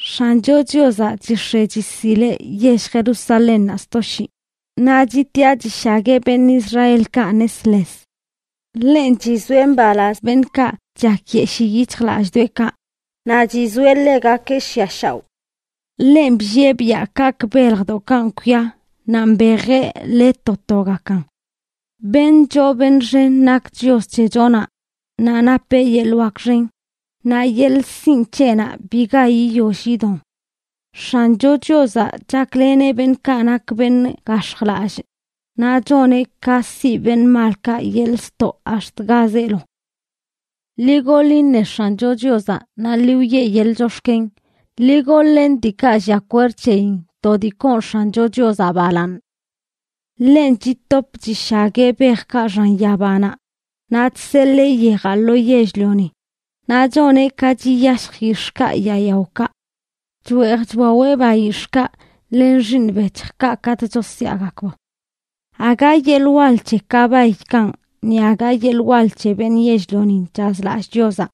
X̱ancho Chiozaꞌ chix̱e chisileꞌ yell Jerusalénnaꞌ sto shii, naꞌ chitiꞌa chishagueꞌ beṉꞌ Israelkaꞌ nesles. Ḻenꞌ chizoeꞌ mbalaz beṉꞌkaꞌ chakyeshii yic̱hjlallꞌdoꞌekaꞌ, naꞌ chizoeꞌ ḻegakeꞌ shiꞌa shaoꞌ. Ḻenꞌ bllieꞌ biaꞌ kaꞌkꞌ beljdoꞌkanꞌ kwia naꞌ mbejeꞌ le to togakan. Beṉꞌ choo beṉꞌ xen nak Chios c̱hechonaꞌ, naꞌ napeꞌ yeḻꞌ wak xen, naꞌ yeḻꞌ sinꞌ c̱heꞌnaꞌ biga yiyoll yidon. X̱ancho Chiozaꞌ chakleneꞌ beṉꞌkaꞌ nak beṉꞌ gax̱jlallꞌ, naꞌ choneꞌ ka siꞌ beṉꞌ malkaꞌ yeḻꞌ ztoꞌ ax̱t ga zeelo. Ḻi goḻ iṉe X̱ancho Chiozaꞌ naꞌ ḻi wiꞌe yeḻꞌ chox̱ken. Ḻi goḻ-len diikaꞌ llia kwerd c̱heyin to dii koon X̱ancho Chiozaꞌ balaaṉ. Ḻenꞌ chitop chishagueꞌ bejkaꞌ xan yabanaꞌ, naꞌ chseḻee yejaꞌ lo yell-lioni, naꞌ choneꞌ ka chiyashj yix̱ꞌkaꞌ yaa yaokaꞌ. Chweej chwaweꞌ bayix̱ꞌkaꞌ len xiiṉ bec̱hjkaꞌ katꞌ chosyaagakb. Aga yeḻꞌ wal c̱he kabaykanꞌ ni aga yeḻꞌ wal c̱he beṉꞌ yell-lionin chazlallꞌ Chiozaꞌ.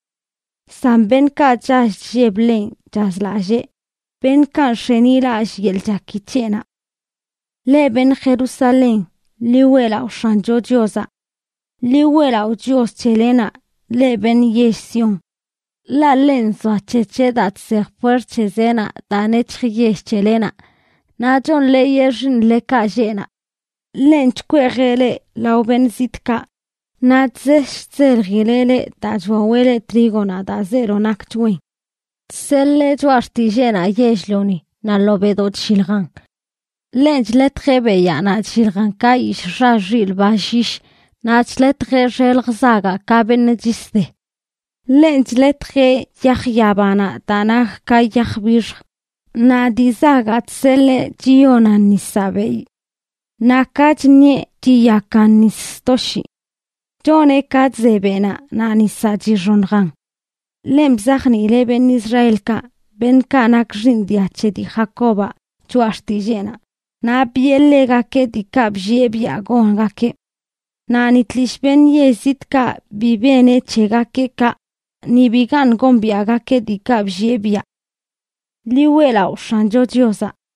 San beṉꞌkaꞌ chall chlleb ḻenꞌ chazlallee, beṉꞌkaꞌ nx̱enilallꞌ yeḻꞌ chaki c̱heꞌnaꞌ. Leꞌ beṉꞌ Jerusalén, ḻi weꞌlaꞌo X̱ancho Chiozaꞌ. Ḻi weꞌlaꞌo Chios c̱helenaꞌ, leꞌ beṉꞌ yell Sión. Ḻaꞌ ḻenꞌ nzoac̱hec̱heꞌ daa chsej puert c̱he zeenaꞌ daa nec̱hj yell c̱helenaꞌ, naꞌ chonḻeeyeꞌ xiiṉlekaꞌ lleꞌ naꞌ. Ḻenꞌ chkweejeꞌ leꞌ lao beṉꞌ zitꞌkaꞌ, naꞌ chzesh chzeljileꞌ leꞌ daa chwaweꞌ leꞌ trígonaꞌ daa zeelo nakch wen. Chseḻee choꞌa xtilleenaꞌ yell-lioni naꞌ ḻobeꞌdoꞌ chlliljan. Ḻenꞌ chḻetjeꞌ beyaa naꞌ chlliljan ka yishꞌ xa xilꞌ ba llyish, naꞌ chḻetjeꞌ xelj zagaꞌ ka beṉꞌ chis de. Ḻenꞌ chḻetjeꞌ yaj yabanaꞌ daa nak ka yaj bixj; naꞌ dii zagaꞌ chseḻee chiyonan nisaꞌ beyꞌ. Naꞌ ka chṉieꞌ, chiyakan nis sto shii. Choneꞌ ka chze beꞌnaꞌ naꞌ nisaꞌ chixoṉjan. Ḻenꞌ bzajniileꞌ beṉꞌ Israelkaꞌ, beṉꞌkaꞌ nak xiiṉ dia c̱he dii Jacobaꞌ, choꞌa xtilleenaꞌ, naꞌ biꞌe ḻegakeꞌ diikaꞌ bllieꞌ biaꞌ gongakeꞌ. Naꞌ ni tlishꞌ beṉꞌ yell zitꞌkaꞌ bi beneꞌ c̱hegakeꞌ kaꞌ, ni bigaṉꞌ gombiaꞌgakeꞌ diikaꞌ bllieꞌ biaꞌ. ¡Ḻi weꞌlaꞌo X̱ancho Chiozaꞌ!